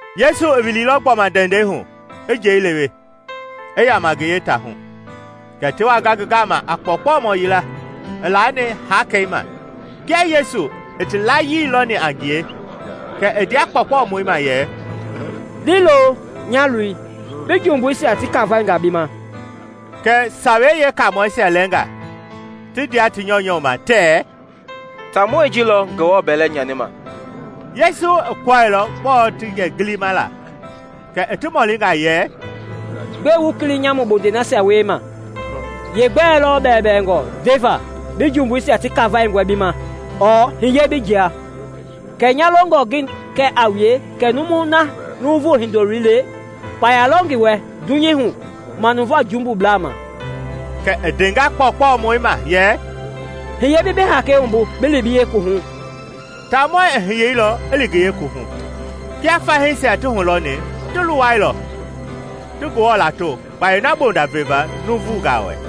Yesu i wililɔ gbɔma ndɛndɛi hu, i njɛi lewe, i yaama ngi yeetaahu. Kɛ ti wanga ngi gama a kpɔɔkpɔmɔ yila, i laani hakei ma. Kia Yesu i ti layii lɔni a ngie, kɛ i ndea kpɔɔkpɔmɔi ma yɛ, “Liilo, nya loi; bi jumbuisia ti kafainga bi ma.” Kɛ Sawei Yeekaamɔisia lɛɛnga ti ndea ti nyɔunyɔ ma tɛɛ, “Taamɔi ji lɔ Ngewɔ bɛlɛ nyanima!” Yesu i kɔɛilɔ gbɔɔ ti gilima la kɛ i ti mɔlinga yɛ, “Gbɛe wu kili nyamu bondei nasia wiema? Yeegbɛ lɔ bɛɛbɛɛngɔ ndeva, ‘Bi jumbuisia ti kafainga bi ma,’ ɔɔ ‘Hiye bi jia?’ Kɛɛ nya longɔ ngi kɛ a wue kɛ numui na Nuuvu Hindoloi le, kpaya lɔ ngi wɛ dunyei hu manuvaa jumbuisia ma.” Kɛ i ndenga kpɔɔkpɔmɔi ma yɛ, “Hiye bi bi hakei wumbu bi li bi yeekuwuhu.” Taamɔi i hiyeilɔ i li ngi yeekuwuhu. Kia fahiisia ti hulɔni, ti luwailɔ, ti Ngewɔ lato kpayei na bonda veva nuuvungaa wɛ.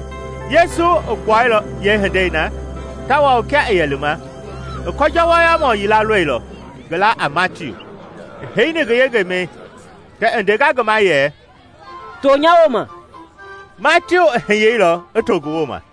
Yesu i gbuailɔ yeehindei na tawao kia i yɛ lima, i kɔnjɔ wɔyɔmɔ yila lɔilɔ, ngi laa a Matiu, i heini ngi yengemɛi. Kɛ i ndenga ngi ma yɛ, “To nya wooma.” Matiu i hiyeilɔ i to ngi wooma.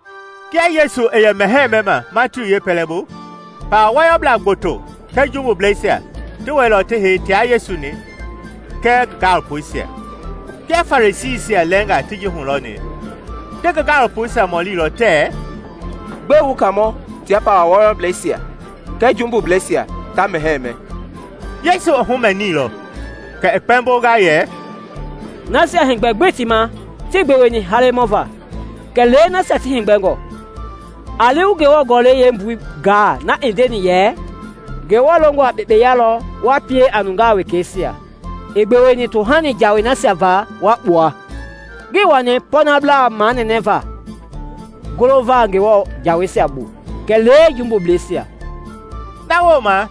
Kia Yesu i yɛ mɛhɛɛ mɛma Matiu yeepɛlɛbu, pawa wɔyɔblaa gboto kɛɛ jumbubleisia ti wɛilɔ ti hei tia Yesu kɛɛ ngi gaalopoisia. Kia Farisiisia lɛɛnga ti ji hulɔni, ti ngi gaalopoisia mɔlilɔ tɛɛ, “Gbɛe wu Kaamɔ tia pawa wɔyɔblɛisia kɛɛ jumbubleisia ta mɛhɛɛ mɛ?” Yesu i humɛniilɔ kɛ i kpɛmbonga yɛ, “Nasia heegbɛ gbii ti ma tii gbeweni halemɔ va, kɛlee nasia ti heegbɛngɔ. A li wu Ngewɔ Gɔlɛi yeembui gaa na i ndeni yɛ, ‘Ngewɔ longɔ a kpekpeya lɔ wa pie a nungaa wekeisia, ii gbeweni tohani jaai nasia va wa kpua.’ Ngii wani pɔɔnablaa manɛnɛma golova Ngewɔ jaweisia bu, kɛlee jumbubleisia.” Na wooma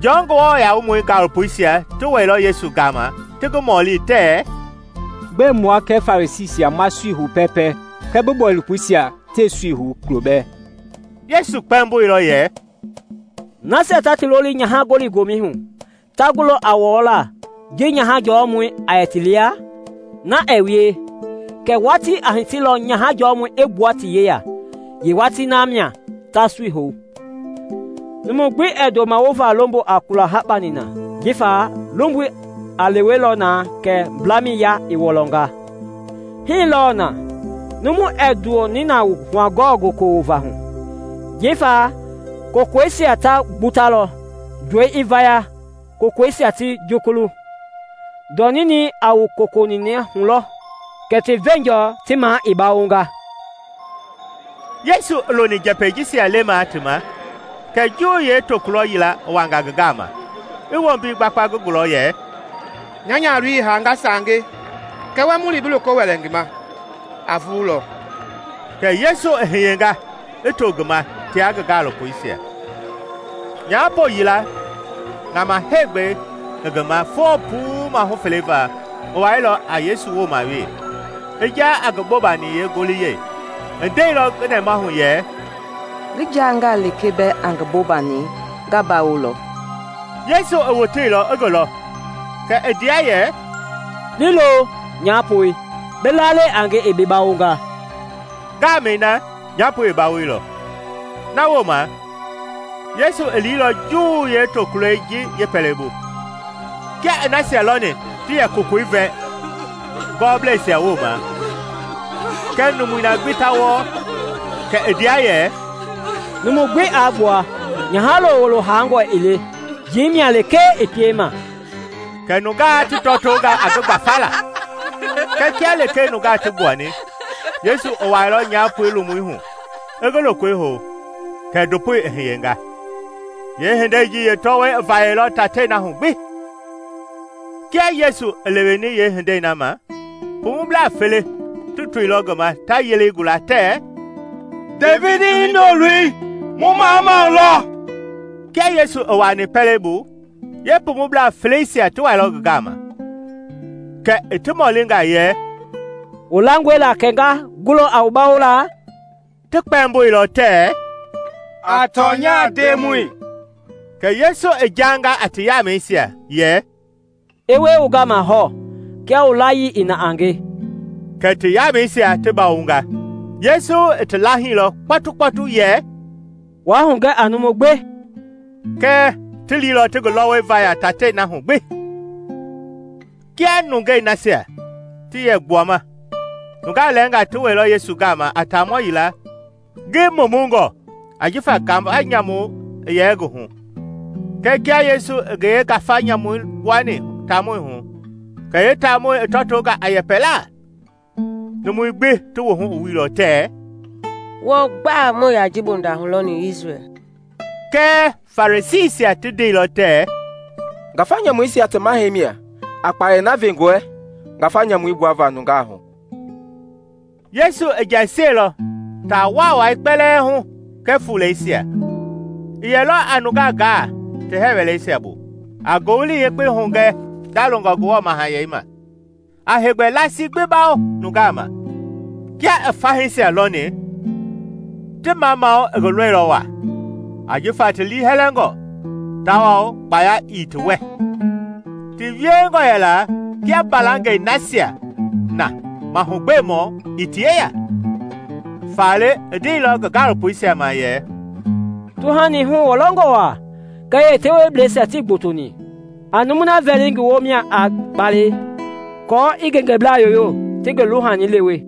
Jɔn Nguamɔi gaalopoisia ti wɛilɔ Yesu gama ti ngi mɔli tɛɛ, “Gbɛe mua kɛɛ Farisiisia ma sui hou pɛɛpɛ kɛɛ bi gaalopoisia tɛɛ su hou kulo bɛɛ?” Yesu kpɛmboilɔ yɛ, “Nasia ta ti loli nyaha-gɔli-gomɛi hu ta gulɔ a wɔɔlaa ji nyaha jɔɔ mɔi a yɛ lɛ ti lia? Na ɛɛ wie! Kɛɛ watii a hitilɔ nyaha jɔmɔi i gbua ti yeya, yeewatii na mia ta sui hou. “Numu gbi ɛɛ ndoma wova lombo a kula hakpa nina, jifa lomboi a lewelɔ na kɛ mblamɛi yaa i wɔlɔnga. Hii lɔɔ na, numu ɛɛ ndɔ nina wu hua-kɔlɔ goko wovangaa hu, jifa kokoisia ta gbutalɔ, ndɔi i vaya, kokoisia ti jukulu. Ndɔ ninɛi a wu koko niinangaa lɔ hu, kɛ ti veenjɔ ti maa i bawonga.” Yesu i loni njɛpɛi jisia lemaa ti ma, kɛ Juu yeetokulɔ yila i wanga ngi gama, i wombi gbakpa ngi gulɔ yɛ, “Nya nyahaloi i haanga saange; kɛɛ wa mu li bi loko wɛlɛ ngi ma, a vululɔ.” Kɛ Yesu i hiyenga i to ngi ma tia ngi gaalopoisia. Nyaapo yila, ŋama heegbɛi i ngi ma foo puu maahu fele va, i wailɔ a Yesu wooma wee, i jaa a ngi bobani yeengoliyɛi. I ndeilɔ ngi nɛmahu yɛ, “Ngi jangaa lekee bɛɛ a ngi bobani, nga bawolɔ.” Yesu i woteilɔ i ngi lɔ, kɛ i ndea yɛ, “Liilo, nyaapoi; bi lalɛi a nge i bi bawonga.” Ngaamɛi na nyaapoi i bawoilɔ. Na wooma, Yesu i liilɔ Juu yeetokulɔi ji yeepɛlɛbu. Kia i nasia lɔni ti yɛ kokoi vɛ ngɔɔblɛisia wooma, kɛɛ numui gbi ta wɔɔ, kɛ i ndea yɛ, “Numui gbi a gbua! Nyaha-lo wuloi haangɔ ii le, njii mia lekee i piema.” Kɛ nungaa ti tɔtonga a ngi gbafala. Kɛɛ kia lekee nungaa ti gbuani, Yesu i wuailɔ nyahaloi lomui hu, i ngi lokoi hou, kɛ ndopoi i hiyenga. Yeehindei ji yee tɔwɔi i vayailɔ taatei na hu gbi. Kia Yesu i leweni yeehindei na ma, pumublaa fele ti toilɔ ngi ma ta yelei gula tɛɛ, “Devidi Hindoloi, mu mamamau lɔ.” Kia Yesu i wuaani pɛlei bu, yee pumublaa feleisia ti wailɔ ngi gama; kɛ i ti mɔlinga yɛ, “Wu langɔe la kɛ nga gulɔ a wu bawola?” Ti kpɛmboilɔ tɛɛ, “A tɔnya, Ndemɔi.” Kɛ Yesu i jaanga a ti yamɛisia yɛ, “I wie wu gama hɔɔ kia wu layii i na a nge.” Kɛ ti yamɛisia ti bawonga. Yesu i ti laahilɔ kpɔtukpɔtu yɛ, “Waa hugɛ a numu gbi.” Kɛɛ, ti liilɔ ti ngi lɔwɔi vaya taatei na hu gbi. Kia nungei nasia ti yɛ gbuama, nungaa lɛɛnga ti wɛilɔ Yesu gama a taamɔ yila ngi mumungɔ ajifa ngafa nyamu i yɛ ngi hu. Kɛɛ kia lekee Yesu i yeengafa nyamui gbuani taamɔi hu kɛ yeetaamɔi i tɔtonga a yɛpɛlaa. Numui gbi ti wuhu i wuilɔ tɛɛ, “Wɔɔ gba muii yaa ji bonda hulɔni Isrɛl.” Kɛɛ Farisiisia ti ndeilɔ tɛɛ, “Ngafa nyamuisia ti mahɛi mia a kpayei na ve ngi wɛ ngafa nyamuisia gbuava nungaa hu.” Yesu i jɛsiɛlɔ taa waawai kpɛlɛɛ hu kɛɛ fuuleisia. I yɛlɔ a nungaa gaa ti hɛɛ wɛleisia bu, a Ngowili Yekpei hugɛ ndalongɔ Ngewɔ Mahayɛi ma, a heegbɛ laasii gbi bawo nungaa ma. Kia i fahiisia lɔni, ti mamamau i ngi lɔilɔ waa, ajifa ti liihɛlɛngɔ tawao kpaya ii ti wɛ, ti wiengɔ kia mbalangɛi nasia mahugbemɔ ii ti yeya. Faale i ndeilɔ ngi gaalopoisia ma yɛ, “Tuhani huwɔlɔngɔ waa, kɛɛ yeteweblɛisia tii gbotoni. A numui na vɛli ngi woo mia a kpalɛi aako i ngengeblaa yoyo ti ngi luhani lewe.� ��